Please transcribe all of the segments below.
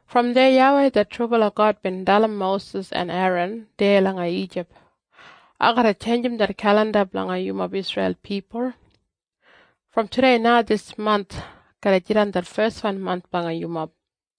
Brom deya YAWEI det trubala God bin dalim Mosis en Eran deya langa Ijip, “Ai garra tjeinjim det kelinda blanga yumob Isreil pipul. Brom tudei na dis manth garra jidan det feswan manth blanga yumob.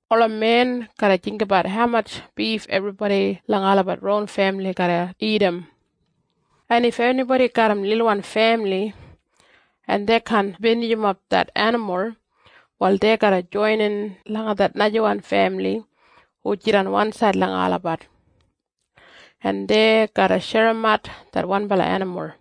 Ola men garra jinggabat haumatj bif ebribodi langa olabat ron femili garra dagat, en if enibodi garram lilwan femili, en dei kaan binijimap det enimul, wal dei garra joinin langa det najawan femili hu jidan wansaid langa olabat, en dei garra sherimat det wanbala enimul.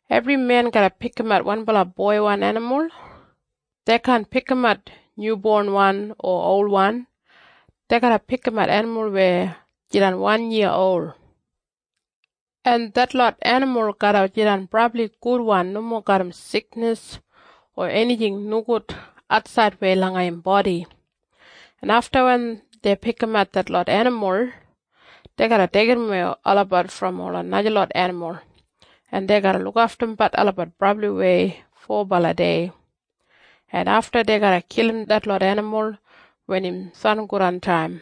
Ebri men garra pikimat wanbala boiwan enimul. Dei kaan pikimat nyubonwan o olwan. Dei garra pikimat enimul weya jidan wanyiya ol. En detlot enimul garra jidan brabli gudwan nomo garram siknis o enijing nogud atsaidwei langa im bodi, en afta wen dei pikimat detlot enimul, dei garra deigidawei olabat brom ola najalot enimul, en dei garra lukaftumbat olabat brabliwei fobala dei, en afta dei garra kilim detlot enimul wen im sangodantaim,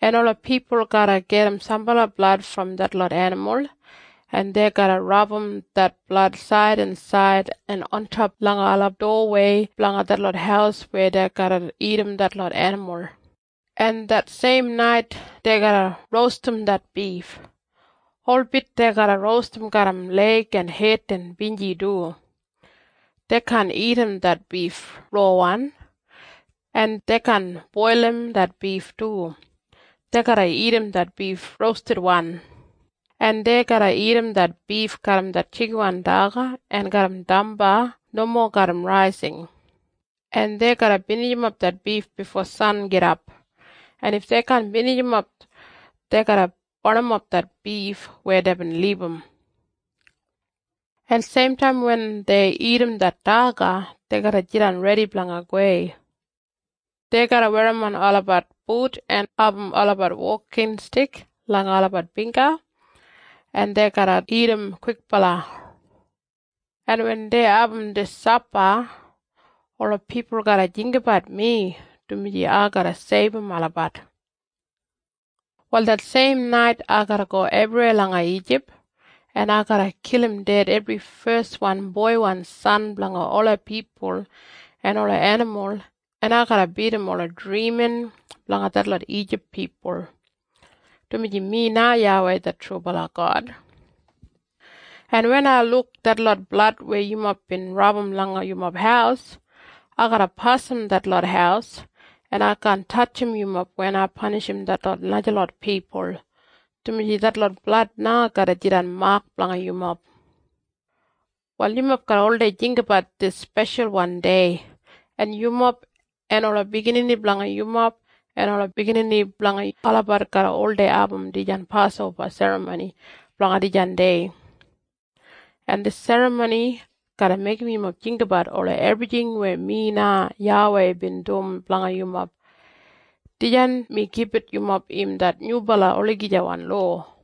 en ola pipul garra gajim sambala blad brom detlot enimul, en dei garra rabum det blad said en said en ontop langa ola dowawei blanga detlot haus weya dei garra dagat detlot enimul, en det seim nait dei garra rostim det bif. Holbit dei garra rostim garram leig en hed en binji du. Dei kaan dagat det bif rauwan, en dei kaan boilim det bif du. Dei garra dagat det bif rostidwan, en dei garra dagat det bif garram det jigiwan daga en garram damba nomo garram raising, en dei garra binijimap det bif bifo sangidap, en if dei kaan binijimap, dei garra barnimap det bif weya deibin libum. En seimtaim wen dei dagat det daga, dei garra jidan redi blanga gowei. Dei garra werrimon olabat but en abum olabat wokinstik langa olabat bingga, en dei garra dagat kwikbala. En wen dei abum dis sapa, ola pipul garra jinggabat mi, dumaji ai garra seibum olabat. “Wal det seim nait ai garra go ebriweya langa Ijip, en ai garra kilim ded ebri feswan boiwan san blanga ola pipul en ola enimul, en ai garra bidim ola drimin blanga detlot Ijip pipul, dumaji mi na YAWEI det trubala God. En wen ai luk detlot blad weya yumob bin rabum langa yumob haus, ai garra pasim detlot haus, en ai kaan tatjim yumob wen ai panishim detlot najalot pipul, dumaji detlot blad na garra jidan mak blanga yumob. “Wal yumob garra oldei jinggabat dis speshalwan dei, en yumob en ola biginini blanga yumob en ola biginini blanga olabat garra oldei abum dijan Pasoba Serramoni blanga dijan dei. En dis serramoni garra meigim yumob jinggabat ola ebrijing weya mi na YAWEI bin dum blanga yumob. Mi na gibit yumob det nyubala olagijawan lowa.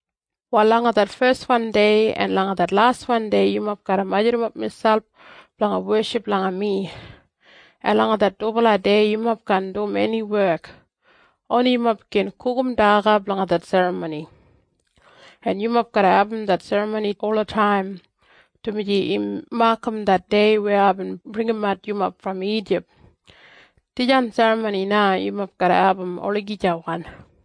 “Wal langa det feswan dei en langa det laswan dei yumob garra majurrumap miselp blanga weship langa mi, en langa det dubala dei yumob kaan dum eni wek. Oni yumob gin gugum daga blanga det serramoni. En yumob garra abum det serramoni olataim, dumaji im makam det dei weya aibin bringimat yumob brom Ijip. Dijan serramoni na yumob garra abum olagijawan.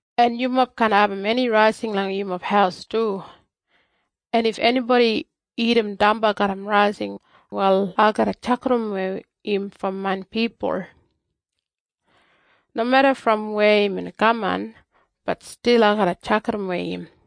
en yumob kaan abum eni raising langa yumob haus du. En if enibodi dagat damba garram raising, wal ai garra tjakidawei im brom main pipul. Nomeda brom weya imbin kaman, bat stil ai garra tjakidawei im.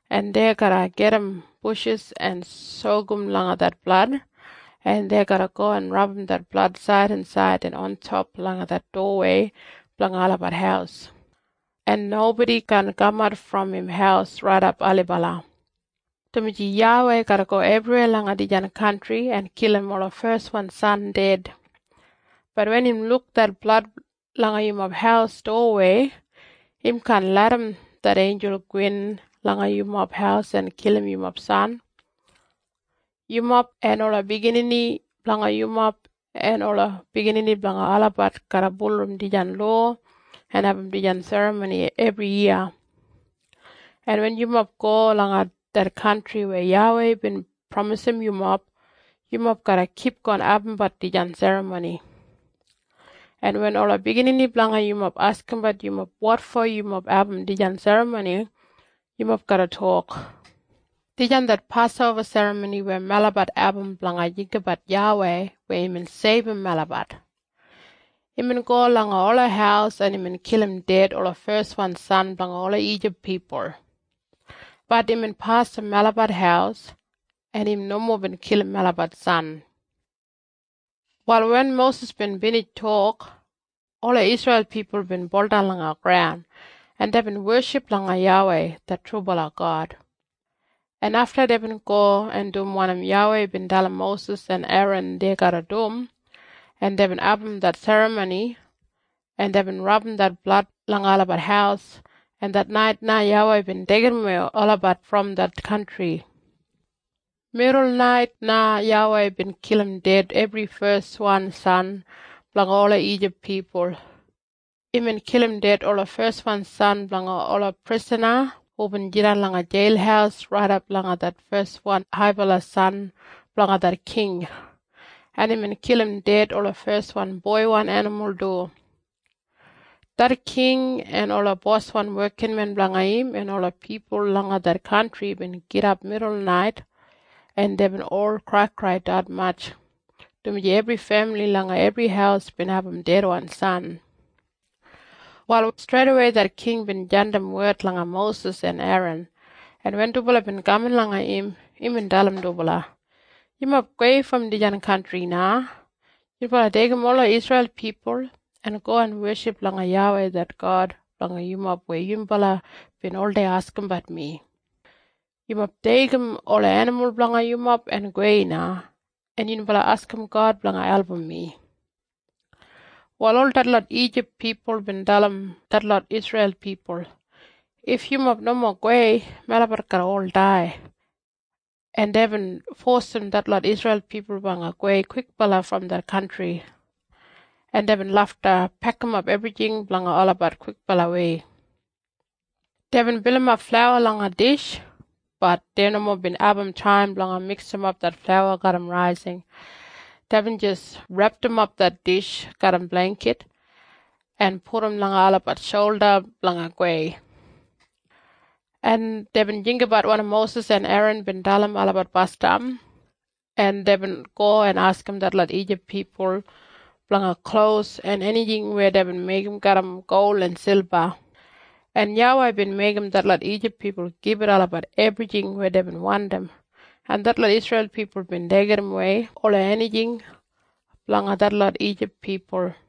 en dei garra gajim bushis en sokum langa det blad, en dei garra go en rabum det blad said en said en ontop langa det dowawei blanga olabat haus, en nobodi kaan kamat brom im haus raidap ailibala, dumaji YAWEI garra go ebriweya langa dijan kantri en kilim ola feswan san ded. Bat wen im luk det blad langa yumob haus dowawei, im kaan larram det einjul gowin langa yumob haus en kilim yumob san. Yumob en ola biginini blanga yumob en ola biginini blanga olabat garra bulurrum dijan lowa en abum dijan serramoni ebriyiya. En wen yumob go langa det kantri weya YAWEI bin pramisim yumob, yumob garra kipgon abumbat dijan serramoni, en wen ola biginini blanga yumob askimbat yumob wotfo yumob abum dijan serramoni, yumob garra tok, ‘Dijan det Pasoba Serramoni weya melabat abum blanga jinggabat YAWEI weya imbin seibum melabat. Imbin go langa ola haus, en imbin kilim ded ola feswan san blanga ola Ijip pipul. Bat imbin pasim melabat haus, en im nomo bin kilim melabat san.’” Wal wen Mosis bin binij tok, ola Isreil pipul bin baudan langa graun, en deibin weship langa YAWEI det trubala God, en afta deibin go en dum wanim YAWEI bin dalim Mosis en Eran dei garra dum, en deibin abum det serramoni, en deibin rabum det blad langa olabat haus, en det nait na YAWEI bin deigidawei olabat brom det kantri. Midulnait na YAWEI bin kilim ded ebri feswan san blanga ola Ijip pipul. Imbin kilim ded ola feswan san blanga ola prisana hubin jidan langa jeil raidap langa det feswan haibala san blanga det king, en imbin kilim ded ola feswan boiwan enimul du. Det king en ola boswan wekinmen blanga im en ola pipul langa det kantri bin gidap midulnait, en deibin ol kraikrai detmatj, dumaji ebri femili langa ebri haus bin abum dedwan san. Wal streidawei det king bin jandim wed langa Mosis en Eran, en wen dubala bin kaman langa im, imbin dalim dubala, “Yumob gowei brom dijan kantri na! Yunbala deigim ola Isreil pipul en go en weship langa YAWEI det God blanga yumob weya yunbala bin oldei askimbat mi. Yumob deigim ola enimul blanga yumob en gowei na. En yunbala askim God blanga album mi.” Wal ol detlot Ijip pipul bin dalim detlot Isreil pipul, “If yumob nomo gowei, melabat garra ol dai.” En deibin fosim detlot Isreil pipul blanga gowei kwikbala brom det kantri, en deibin lafta pekimap ebrijing blanga olabat kwikbalawei. Deibin bilimap flauwa langa dish. Bat dei nomo bin abum taim blanga miksimap det flauwa garram raising. Deibin jis repdimap det dish garram bleingkit en pudum langa olabat sholda blanga gowei. En deibin jinggabat wanim Mosis en Eran bin dalim olabat basdam, en deibin go en askim detlot Ijip pipul blanga klos en enijing weya deibin meigim garram gol en silba, en YAWEI bin meigim detlot Ijip pipul gibit olabat ebrijing weya deibin wandim, en detlot Isreil pipul bin deigidawei ola enijing blanga detlot Ijip pipul.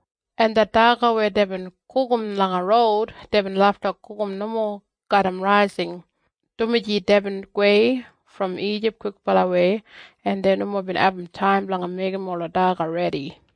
En langa roud deibin lafta gugum daga nomo garram raising dumaji deibin gowei brom Ijip kwikbalawei, en dei nomo bin abum taim blanga meigim ola daga redi.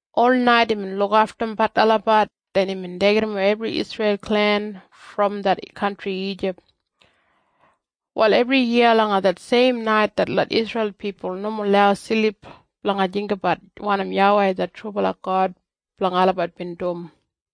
Olnait imbin lukaftumbat olabat, en imbin deigidawei ebri Isreil klen brom det kantri Ijip. Wal ebriyiya langa det seim nait detlot Isreil pipul nomo lau silip blanga jinggabat wanim YAWEI det trubala God blanga olabat bin dum.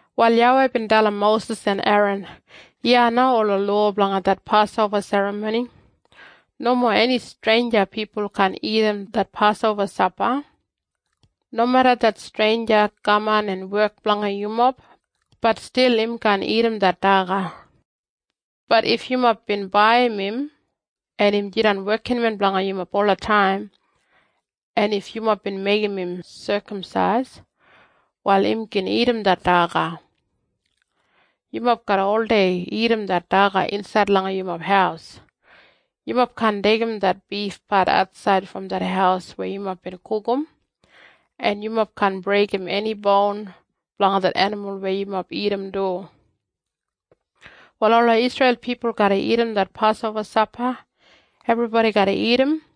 Wal YAWEI bin dalim Mosis en Eran, “Iya na ola lowa blanga det Pasoba Serramoni. Nomo eni streinja pipul kaan dagat det Pasoba sapa. Nomeda det streinja kaman en wek blanga yumob, bat stil im kaan dagat det daga. Bat if yumob bin baiyim im, en im jidan wekinmen blanga yumob olataim, en if yumob bin meigim im sekamsais, wal im gin dagat det daga. Yumob garra oldei dagat det daga insaid langa yumob haus. Yumob kaan deigim det bifpat atsaid brom det haus weya yumob bin gugum, en yumob kaan breigim eni boun blanga det enimul weya yumob dagat du. “Wal ola Isreil pipul garra dagat det Pasoba sapa. Ebribodi garra dagat.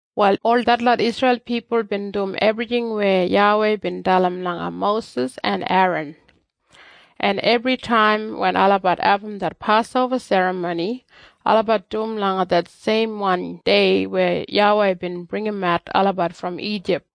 Wal ol detlot Isreil pipul bin dum ebrijing weya YAWEI bin dalim langa Mosis en Eran. En ebritaim wen olabat abum det Pasoba Serramoni, olabat dum langa det seimwan dei weya YAWEI bin bringimat olabat brom Ijip.